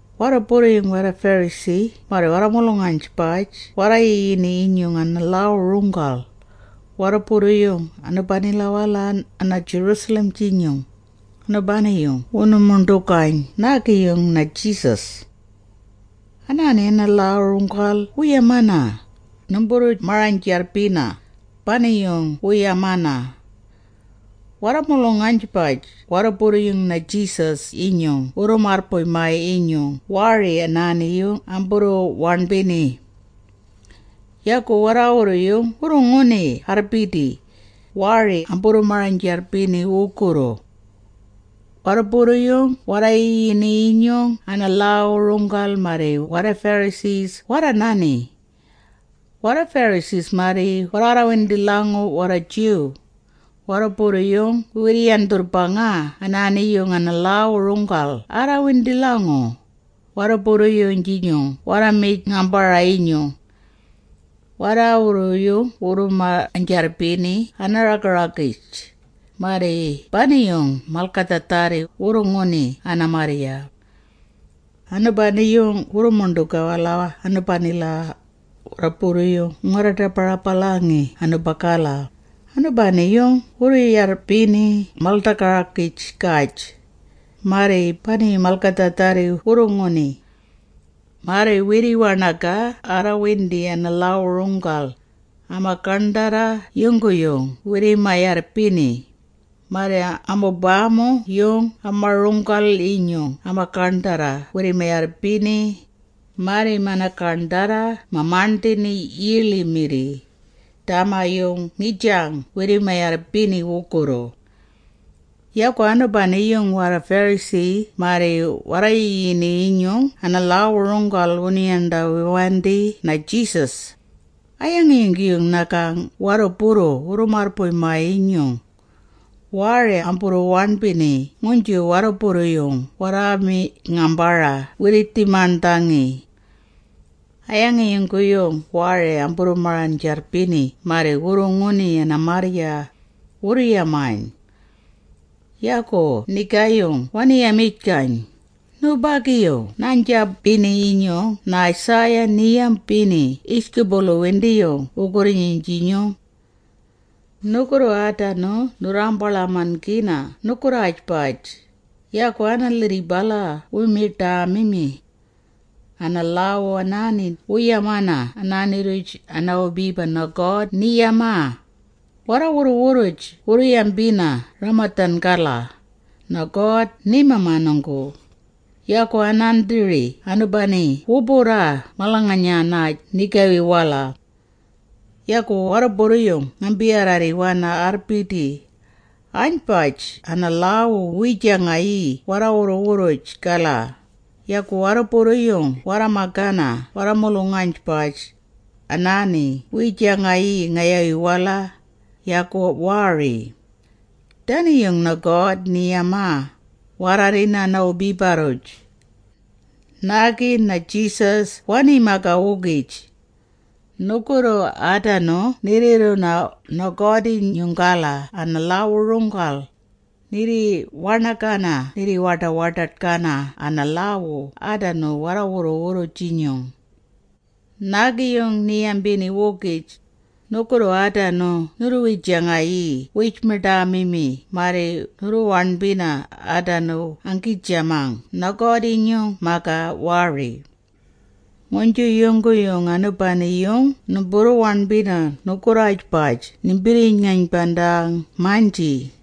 Warruburru-yung warra-Pharisee marri mulung-aynbaj warra-yiyini-yinyung ana-lhaawu-runggal, warruburru-yung anubanila ana-Jerusalem-jinyung, anubani-yung wunu-muṉḏugayn naagi-yung na-Jesus. Anaani ana-lhaawu-runggal wu-yamana, “Numburru-marang-jarrbina,” bani-yung wu-yamana. Warra-mulung-aynbaj warruburru-yung na-Jesus-jinyung wurru-marrbuy-maa-yinyung waari anaani-yung amburru-waṉbini. Yagu warraawurru-yung wurru-nguni arrbidi, waari amburru-marang-jarrbini wugurru. Warruburru-yung warra-yiyini-yinyung ana-lhaawu-runggal marri warra-Pharisee warra-nani. Warra-Pharisee marri warraarrawindi-lhangu warra-Jew, warruburru-yung wirri-yandhurrbangaa anaani-yung ana-lhaawu-runggal anaarrawindi-lhangu, warruburru-yung-jinyung warra-mi…yn-ngambara-yinyung. Warraawurru-yung wurru-marang-jarrbini ana-raga-ragij, marri bani-yung malgadhaadharri wurru-nguni ana-marrya. Anubani-yung wurru-muṉḏugaa-wala anubagala, warruburru-yung wuu-ngarra-ḏaba-rabalangi anubagala, anubani-yung wuu-yarrbini mal-ḏaga-ragij-gaj, marri bani-yung malgadhaadharri wurru-nguni. Marri wirri-waṉagaa arrawindi ana-lhaawu-runggal, ama-gaṉdharra yungguyung wirrima-yarrbini, marri amubama-yung ama-runggu-runggal-inyung ama-gaṉdharra wirrima-yarrbini, marri mana-gaṉdharra ma-maṉdhini yiiḻi-mirri, dama-yung ngijang wirrima-yarrbini wugurru. Yagu anubani-yung warra-Pharisee marri warra-yiyini-yinyung ana-lhaawu-runggal wunu-yandhawiwandi na-Jesus, “A-yangi yungguyung nagang warruburru wurru-marrbuy-maa-yinyung, waari amburru-waṉbini nguynju warruburru-yung warra-mi…yn-ngambara wirriij-maṉdhangi? A-yangi yungguyung waari amburru-marang-jarrbini marri wurru-nguni ana-marrya?” wurru-yamayn. Yagu nigaayung wani-yamijgayn, “Nubagi-yung naa-ja-jambini-yinyung na-Isaiah, ni-yambini yijgubulu-windiyung nugurri-nyinyung. Nugurru aadanu nurraambaḻaman-gina nugurraajbaj, yagu ana-lhirribala wu-miḏaamimi. Ana-lhaawu anaani wu-yamana anaani-rruj a-wubiba, na-God ni-yamaa, ‘Warra-wurru-wurruj wuu-yambina a-ramadhan-gala, “na-God ni-mamanunggu,” yagu anaandhiri anubani wu-burraa malanganya…nay ngayawi-wala. Yagu warruburru-yung ngambi-warraarriwana arrbidi, Anaaynbaj ana-lhaawu wiijanggi warra-wurru-wurruj-gala, yagu warruburru-yung warra-magana warra-mulung-aynbaj, anaani wiijanggi ngayawi-wala, yagu waari.’ Dani-yung na-God ni-yamaa, waarrarrina a-wubiba-rruj.” Naagi-yung na-Jesus wani-magaa-wugij. “Nugurru aadanu nirriirruna na-God-jinyung-gala a-lhaawu-runggal, nirri-waṉagana nirri-waḏa-waḏaḏ-gana ana-lhaawu aadanu warra-wurru-wurruj-jinyung.” Naagi-yung ni-yambini-wugij, “Nugurru aadanu nurru-wijangayii wiij-miḏaamimi marri nurru-waṉbina aadanu anggiijamang na-God-jinyung-magaa waari. Nguynju yungguyung anubani-yung numburru-waṉbina nugurri-waj nimbirri-ngaynbandang-maynji!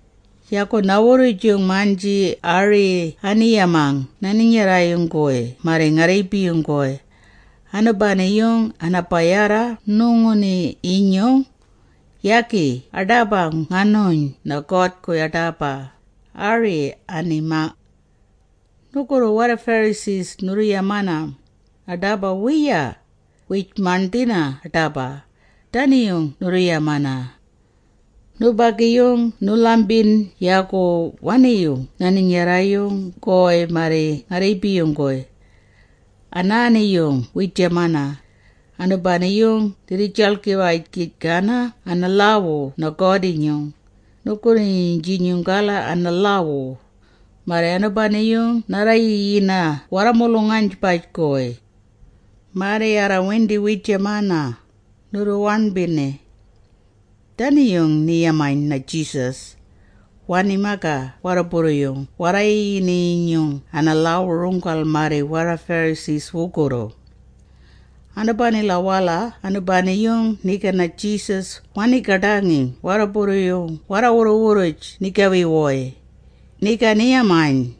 “Yagu na-wurrujung-maynji ari ani-yamang na-ninyarra-yung-guy marri nga-rriibi-yung-guy, ‘Anubani-yung ana-bayarra nuguṉi-nyinyung, yagu aḏaba nganu-yayn na-God-guy aḏaba,’ ari ani-yamang. Nugurru warra-Pharisee nurru-yamana, aḏaba wiiya, wiij-maṉdhina aḏaba, dani-yung nurru-yamana. Nubagi-yung numbunu-lhambiyn yagi wani-yu ni-ninyarra-yung-guy marri nga-rriibi-yung-guy. Anaani-yung wiijamana, anubani-yung nirriijaḻgiwijgana ana-lhaawu na-God-jinyung, nugurri-nyinyung-gala a-lhaawu, marri anubani-yung narra-yiyina warra-mulung-aynbaj-guy. Marri arrawindi, wiijamana, nurru-waṉbina.” Dani-yung ni-yamayn na-Jesus, wani-magaa warruburru-yung warra-yiyini-yinyung ana-lhaawu-runggal marri warra-Pharisee wugurru. Anubanila-wala anubani-yung niga na-Jesus wanii-gaḏangi warruburru-yung warra-wurru-wurruj nigawi-wuy, niga ni-yamayn,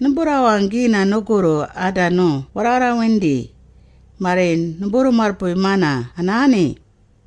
“Numburraawanggina nugurru aadanu warraarraarrawindi, marri numburru-marrbuy-mana anaani.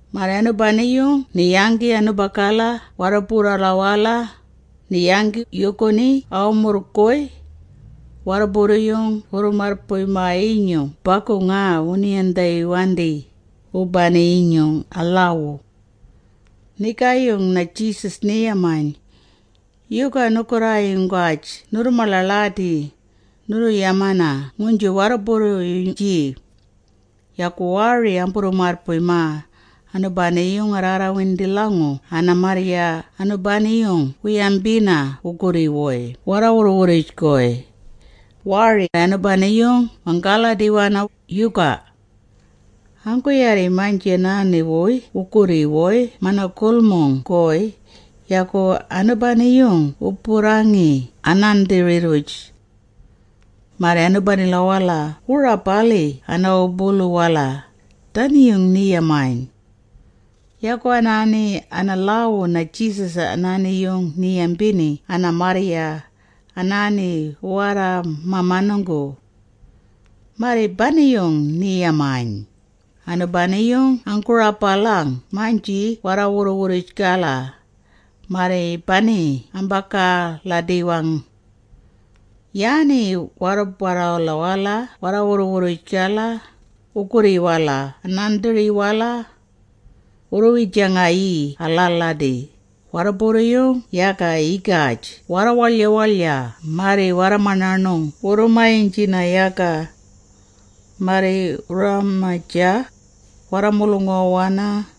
Marri anubani-yung ni-yanggi anubagala warruburrala-wala, ni-yanggi yuuguni a-wumurrng-guy. Warruburru-yung wurru-marrbuy-maa-yinyung bagu nga wunu-yandhawiwandi, wubani-yung a-lhaawu. Nigaayung na-Jesus ni-yamayn, “Yuga nugurraayunggaj nurru-maḻaḻadi, nurru-yamana nguynju warruburru-yung-jii? Yagu waari numburru-marrbuy-maa, anubani-yung anaarrawindi-lhangu ana-marrya anubani-yung wu-yabina wugurri-wuy warra-wurruj-guy, waari anubani-yung wanggaaladi-wi, yuga? Anggu-yaarri-maynji anaanu-wuy wugurri-wuy mana-gulmung-guy, yagi anubani wu-burrangi anaandhiri-rruj. Marri anubanila wu-rabalii ana-wubulu-wala.” Dani-yung ni-yamayn. Yagu anaani ana-lhaawu na-Jesus anaani-yung ni-yambini ana-marrya, anaani wu-warra-mamanunggu. Marri bani-yung ni-yamayn, “Anubani-yung anggu-rabalang-maynji warra-wurruj-gala, marri bani-yung ambanggaaladi-wang. Yaani warruburrala-wala warra-wurru-wurruj-gala, wugurri-wala aandhiri-wala. Wurru-wijangayii alaaladi, warrubawa-yung yaga yigaj warra-waḻya-waḻya marri warra-maṉaṉung wurru-maynjina yaga. Marri wurraamajaa, warra-mulunguwa-wana,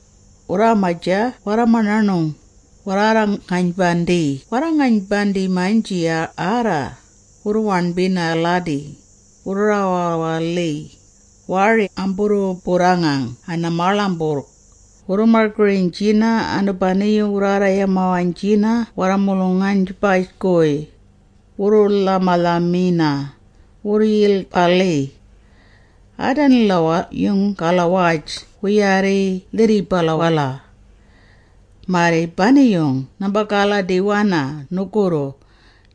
warraagamajaa warra-maṉaṉung, warraa-garra-ngaynbandii warraaynbaj-jinyung arra, wurraaṉbina aladi, wurraawaḻii, waari amburru-burrangang ana-maaḻamburrg, wurru-margirajaa, anubani-yung warraarra-yamawaynjina warra-mulung-aynbaj-guy, wurru-lhama-lhamina, wurru-yilg-balii. “Aadanila-yung-galawaj wu-yaarri lhirribala-wala. Marri bani-yung nambanggaaladi-wana nugurru.”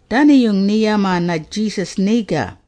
Dani-yung ni-yamaa na-Jesus niga.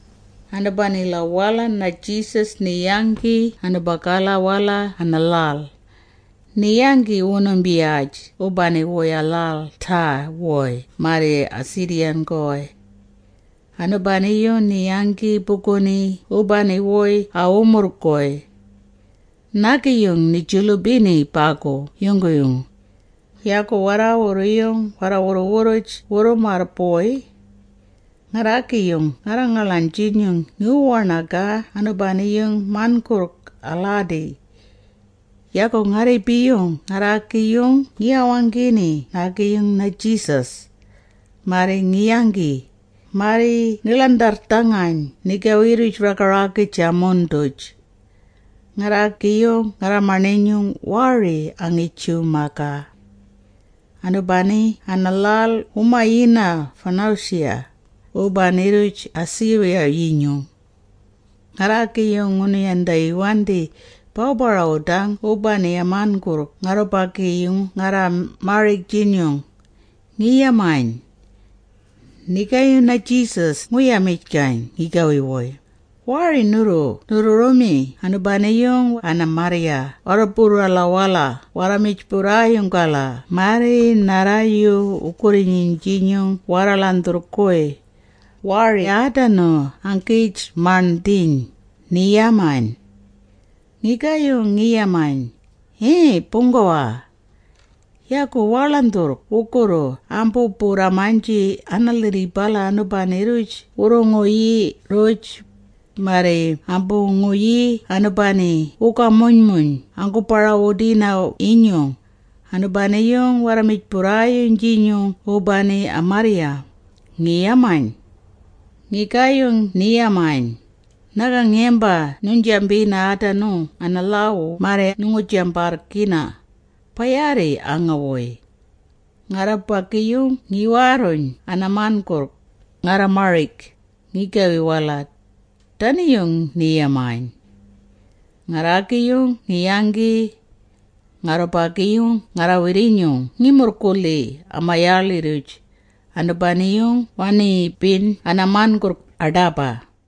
Anubanila-wala na-Jesus ni-yanggi anubanila-wala ana-lhal. Ni-yanggi wunumbiyaj wubani-wuy a-lhal a-Tyre-wuy marri a-Sidon-guy. Anubani-yung ni-yanggi buguni wubani-wuy a-wumurrng-guy. Naagi-yung ani-julubini bagu yungguyung. Yagu warraawurru-yung warra-wurru-wurruj wurru-marrbuy. Ngarraagi-yung ngarra-ngaḻaynjinyung ngiwu-waṉagaa anubani-yung man.gurrg aladi. Yagu nga-rriibi-yung ngarraagi-yung ngi-wawanggini naagi-yung na-Jesus. Marri ngi-yanggi, marri ngi-ḻandharrdhangayn nigawi-rruj raga-ragij a-mun-duj. Ngarraagi-yung ngarra-maṉinyung waari angi-Jew-magaa. Anubani ana-lhal wu-mayina Phonecia, wubani-rruj a-Syria-yinyung. Ngarraagi-yung ngunu-yandhawiwandi, “Bawu-barawudang wubani a-man.gurrg ngarrubagi-yung ngarra-marig-jinyung,” ngi-yamayn. Nigaayung na-Jesus ngu-yamijgayn ngigawi-wuy, “Waari nurru nurru-mi anubani-yung ana-marrya warruburrala-wala warra-mijburrayung-gala marri narra-yu wugurri-nyinyung warra-ḻandhurrg-guy, waari aadanu anggiij-maṉdhiiyn.” ni-yamaa. Ngigaayung ngi-yamayn, “Yii Buunggawa! Yagu waa-ḻandhurrg wugurru ambu-burraa-maynji ana-lhirribala, anubani-rruj wurru-nguyu-nguyii-rruj, marri ambu-nguyii anubani-yung wugamuymuy anggaadbarrwina-yinyung, anubani-yung warra-mijburrayung-jinyung wubani a-marrya,” ngi-yamayn. Nigaayung ni-yamayn, “Nagang yamba nuynjambini aadanu ana-lhaawu, marri nu-jambarrgina, ba-yaarri aanga-wuy. Ngarrubagi nginggaarruyn ana-man.gurrg, ngarra-ngarrimarig, ngigawi-wala.” Dani-yung ni-yamayn. Ngarraagi-yung ngi-yanggi. Ngarrubagi-yung ngarra-wirrinyung ngi-murrgulhii ama-yaaḻi-rruj, anubani-yung waaṉibiyn ana-man.gurrg aḏaba.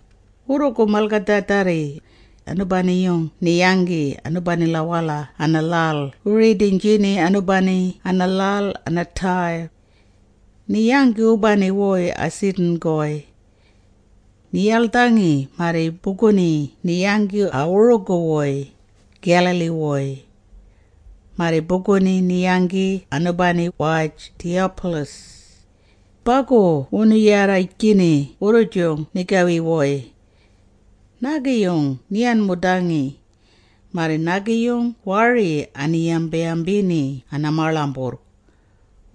Wurrugu malgadhaadharri, anubani-yung ni-yanggi anubanila-wala ana-lhal wu-ridiynjini anubani ana-lhal ana-Tyre. Ni-yanggi wubani-wuy a-Sidon-guy. Ni-yaḻdhangi marri buguni ni-yanggi a-wurugu-wuy, Galilee-wuy. Marri buguni ni-yanggi anubani-waj Decapolis. Bagu wunu-yarrijgini wurrujung nigawi-wuy. Naagi-yung ni-wan-mudangi, marri naagi-yung waari ani-yamba-yambini ana-maaḻamburrg.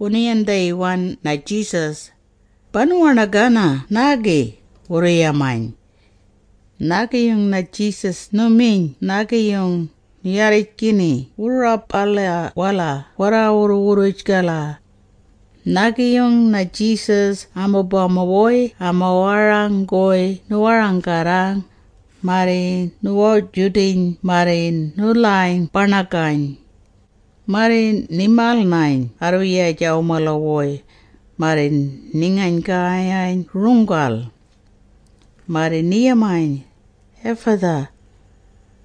Wunu-yandhawiwayn na-Jesus, “Banu-waṉagang naagi,” wurru-yamayn. Nigaayung na-Jesus nu-miyn naagi-yung, nu-yarrijgini warruburrala-wala warra-wurru-wurruj-gala. Naagi-yung na-Jesus amubama-wuy ama-warang-guy nu-warang-araa, marri ni-wa-judiyn marri nu-lhayn-baṉagayn. Marri ni-mal-nayn arrwiyaj, a-wumala-wuy, marri ni-ngayn.gayayn runggal. Marri ni-yamayn, “Ephatha.”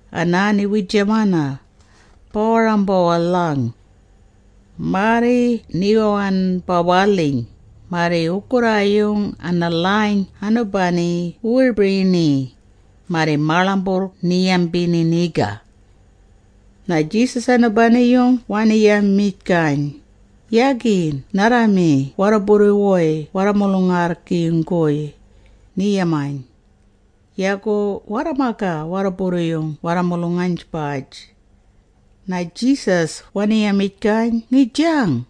Anaani wiijamana, ba-warang-bawalhang. Marri ni-wan-bawalhi, marri wugurraayung ana-lhayn anubani wu-wirbirini, marri maaḻamburrg ni-yambini niga. Na-Jesus anubani-yung wani-yamijgayn, “Yagi narra-magi warruburru-wuy warra-mulung-arrgi-yung,” ni-yamayn. Yagu warra-magaa warruburru-yung warra-mulung-aynbaj. Yagu na-Jesus wani-yamijgayn ngijang,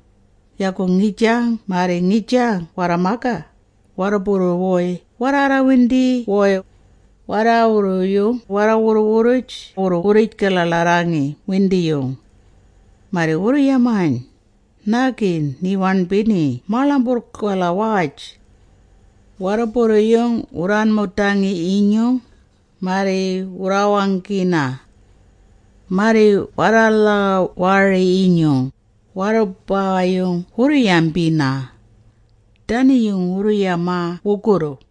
yagu ngijang marri ngijang warra-magaa, warruburru-wuy warraarraarrawindi-wuy. Warraawurru-yung warra-wurru-wurruj wurru-wurrij-gaḻaaḻarrangi windiyung. Marri wurru-yamayn, “Naagi ni-waṉbini maaḻamburrg-galawaj! Warrubawa-yung wu-wan-mudii-yinyung, marri wu-wawanggina! Marri warra-lhaawu-wari-yinyung, warrubawa-yung wurru-yambina!” Dani-yung wurru-yamaa wugurru.